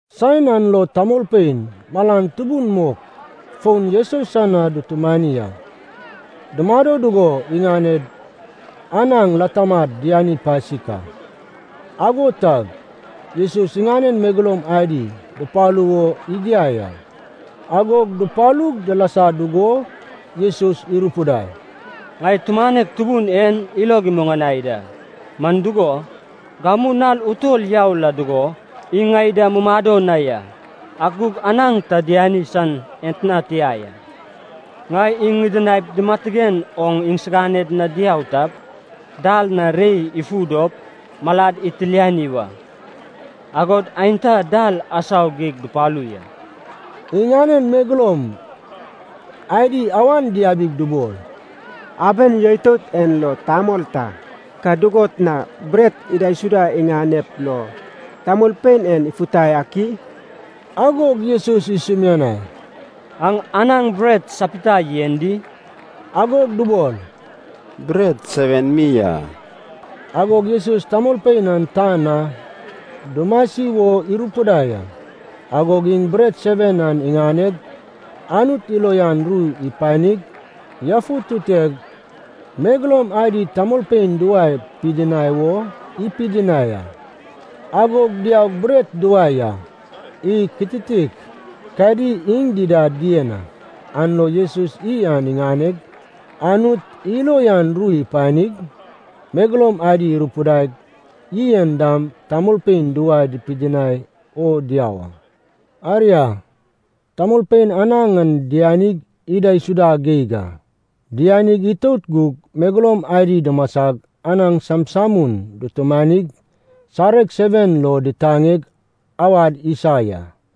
Saen an lo tamolpein malan tubun mok fon Jesus san na dutumani a. Dumado dugo iŋaned anaŋ latamad diani pasik a. Ago tag, Jesus iŋanen megeloum adi dupalu wo igiai a. Agog dupalug dilasa dugo Jesus irupidai, “Ŋai tumanek tubun en ilog imuŋanai da, man dugo, gamu nal utol yau la dugo iŋ ŋai da mumado na ya, ak gug anaŋ ta diani san etna tia ya. Ŋai iŋ ŋidinaip dimatigen oŋ iŋsiganed na diau tap, dal na rei ifu dop malad itilani wa. Agod aenta dal asau geig dupalu ya.” Iŋanen megeloum adi awan diabig dubol, “Aben yoitout en lo tamol ta, ka dugot na bret idaisuda iŋanep lo tamolpein en ifutai ak i?” Agog Jesus isumianai, “Aŋ anaŋ bret sapita yen di?” Agog dubol, “Bret seven mi a.” Agog Jesus tamolpein an tan na dumasi wo irupidai a. Agog iŋ bret seven an iŋaneg, Anut ilo uyan ru ipanig, yafututeg, megeloum adi tamolpein duwae pidinai o ipidinai a. Agog diaug bret duwae ya. Iy kititik kadi iŋ dida dien a. An lo Jesus iy an iŋaneg, Anut ilo uyan ru ipanig, megeloum adi irupidaig iy en dam tamolpein duwae pidinai o diau a. Aria, tamolpein anaŋ an dianig idaisuda geig a. Diani itout gug megeloum adi dumasag anaŋ samsamun dutumanig sareg seven lo ditaneg awad isa ya.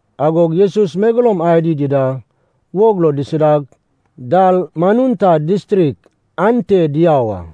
Agog Jesus megeloum adi dida wog lo disidag, Dalmanuta distrik ante diau a.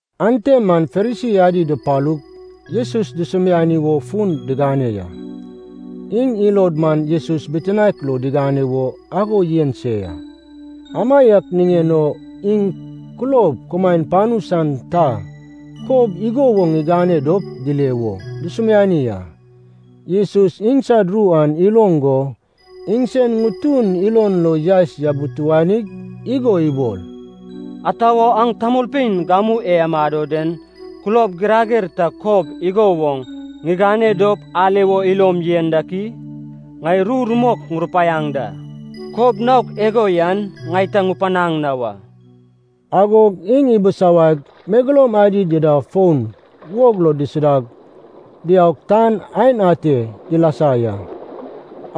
Ante man Farisi adi dupalug Jesus dusumiani wo fun digane ya. Iŋ ilod man Jesus bitinaek lo digane wo ago yen se ya. Amaiak niŋen o iŋ kulob kumaen panu san ta kob igo woŋ igane dop dile wo dusumiani a. Jesus iŋsad ru an iloŋ go iŋsen ŋutun ilon lo yaes yabituanig igo ibol, “Ata wo aŋ tamolpein gamu e amado den kulob girager ta kob igo woŋ ŋigane dop ale wo ilom yen dak i? Ŋai ru rumok ŋurupaiaŋ da, kob naok igo yan ŋai ta ŋupanaŋ na wa.” Agog iŋ ibisawaig, megeloum adi dida fon wog lo disidag, diaug, tan aen ate dilasa ya.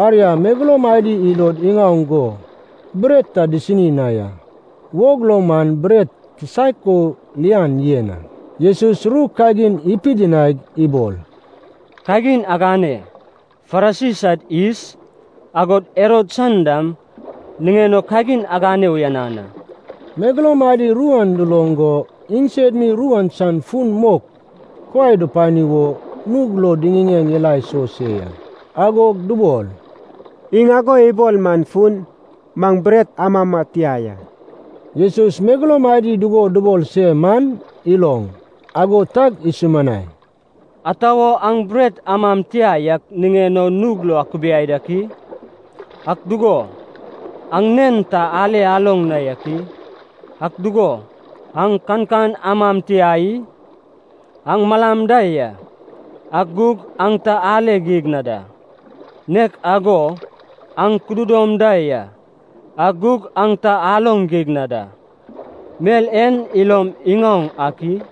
Aria, megeloum adi ilod iŋaoŋ go bret ta disini na ya, wog lo man bret kisaek o lian yen a. Jesus ru kagin ipidinaig ibol, “Kagin agane, Farisi sad yis, agod Herod san dam niŋen o kagin agane uyanan a.” Megeloum adi ru an duloŋ go iŋsed mi ru an san fun mok kuai dupani wo nug lo diŋiŋeŋ ila iso se ya. Agog dubol, “Iŋ ago ibol man fun, maŋ bret amama tia ya.” Jesus megeloum adi dugo dubol se man iloŋ, ago tag isumianai, “Ata wo aŋ bret amam tia yak niŋen o nug lo akubiai dak i? Ak dugo, aŋ nen ta ale aloŋ na yak i? Ak dugo, aŋ kankan amam tia i? Aŋ malam da ya, ak gug aŋ ta ale geig na da. Nek ago aŋ kududom da ya, ak gug aŋ ta aloŋ geig na da. Mel en ilom iŋaoŋ ak i?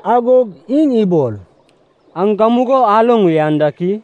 Agog iŋ ibol, “Aŋ gamugo aloŋ uyan dak i?”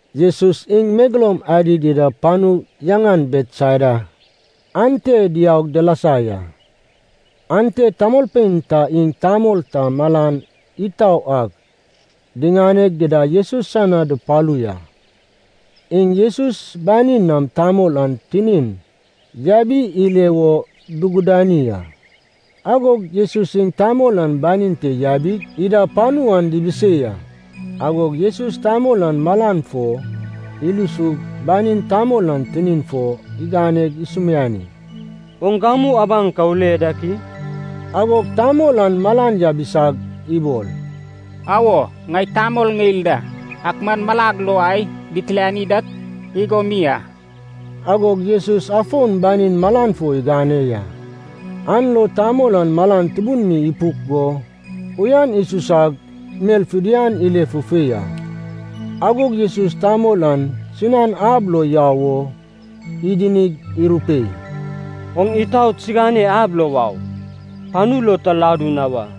Jesus iŋ megeloum adi dida panu yaŋan Betsaida ante diaug dilasa ya. Ante tamolpein ta iŋ tamol ta malan itau ak diŋaneg dida Jesus san na dupalu ya. Iŋ Jesus banin nam tamol an tinin yabi ile wo dugudani a. Agog Jesus iŋ tamol an banin te yabig, ida panu an dibisei a. Agog Jesus tamol an malan fo ilusug banin tamol an tinin fo iganeg isumiani, “Oŋ gamu abaŋ ka ule dak i?” Agog tamol an malan yabisag ibol, “Awo, ŋai tamol ŋeil da, ak man malag lo ai ditiliani dak igo mi a.” Agog Jesus afon banin malan fo igane ya. An lo tamol an malan tubun mi ipuk go uyan isusag mel fidian ile fufei a. Agog Jesus tamol an sinan ab lo yau o idinig irupei, “Oŋ itaot sigane ab lo wau, panu lo ta ladu na wa.”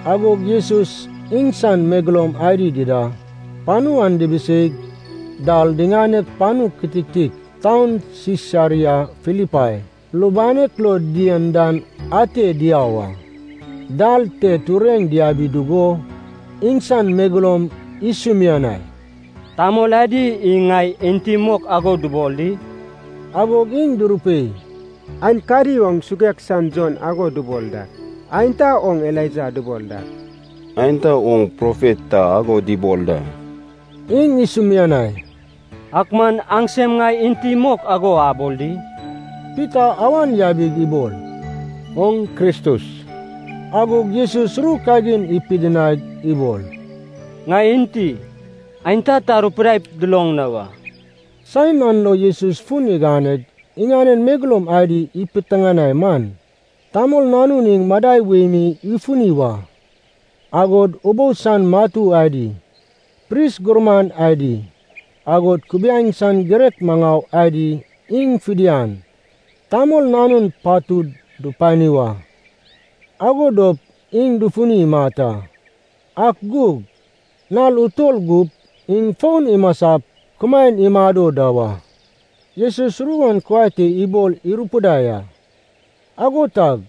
Agog Jesus iŋsan megeloum adi dida panu an dibiseig dal diŋaneg panu kititik taun Sisaria Filipai lubanek lo dien dan ate diau a. Dal te tureŋ diabi dugo iŋsan megeloum isumianai, “Tamol adi iŋ ŋai enti mok ago dubol di?” Agog iŋ durupei, “Aenkadi oŋ Suguek san Jon ago dubol dak, aenta oŋ Elaija dubol dak, aenta oŋ profet ta ago dubol da.” Iŋ isumianai, “Ak man aŋsem ŋai enti mok ago abol di?” Pita awan yabig ibol, “Oŋ Kristus.” Agog Jesus ru kagin ipidinaig ibol, “Ŋai enti, aenta ta arupidaip duloŋ na wa.” Saen an lo Jesus fun iganeg iŋanen megeloum adi ipiteŋanai man, Tamol Nanun iŋ madai wei mi ifuni wa, agod ubou san matu adi, pris gurman adi, agod kubiaeŋ san girek maŋau adi iŋ fidian Tamol Nanun patud dupani wa. Ago dop iŋ dufuni imat a. Ak gug nal utol gup iŋ fon imasap kumaen imado da wa. Jesus ru an kuai te ibol irupidai a. Ago tag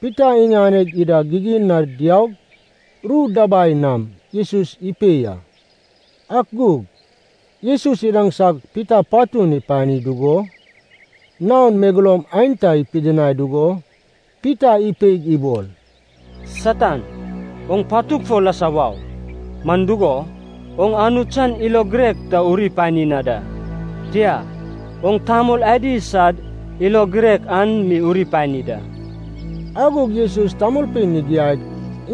Pita iŋaneg ida gigin na diaug ru dabai nam Jesus ipei a. Ak gug Jesus idaŋsag Pita patun ipani dugo naon megeloum aenta ipidinai dugo Pita ipeig ibol, “Satan, oŋ patug fo lasa wau! Man dugo, oŋ Anut san ilo girek ta uri pani na da, tia, oŋ tamol adi sad ilo girek an mi uri pani da.” Agog Jesus tamolpein igiaig,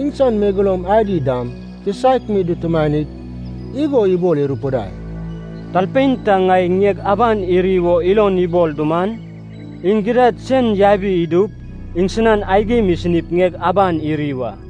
iŋsan megeloum adi dam kisaek mi dutumanig, igo ibol irupidai, “Talpein ta ŋai ŋieg aban iri wo ilon ibol duman, iŋ gidad sen yabi idup iŋsinan aigim isinip ŋieg aban iri wa.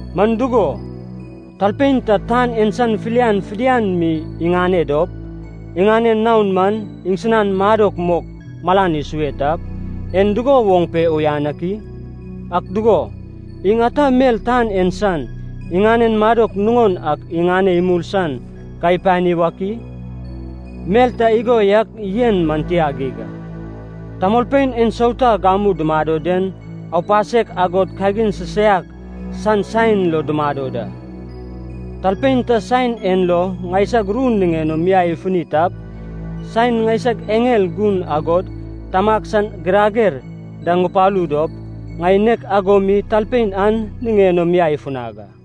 Man dugo, talpein ta tan en san filian fidian mi iŋane dop, iŋanen naon man iŋsinan madok mok malan isue tap, en dugo woŋ pe uyan ak i? Ak dugo, iŋ ata mel tan en san, iŋanen madok nuŋon ak iŋane imul san ka ipani wak i? Mel ta igo yak yen man tia geig a. Tamolpein ensauta gamu dumado den aupasek agod kagin sisaiak san saen lo dumado da. Talpein ta saen en lo ŋaisag ru niŋen o miai ifuni tap, saen ŋaineg eŋel gun agod Tamag san girager da ŋupalu dop, ŋai nek ago mi talpein an niŋen o miai ifunag a.”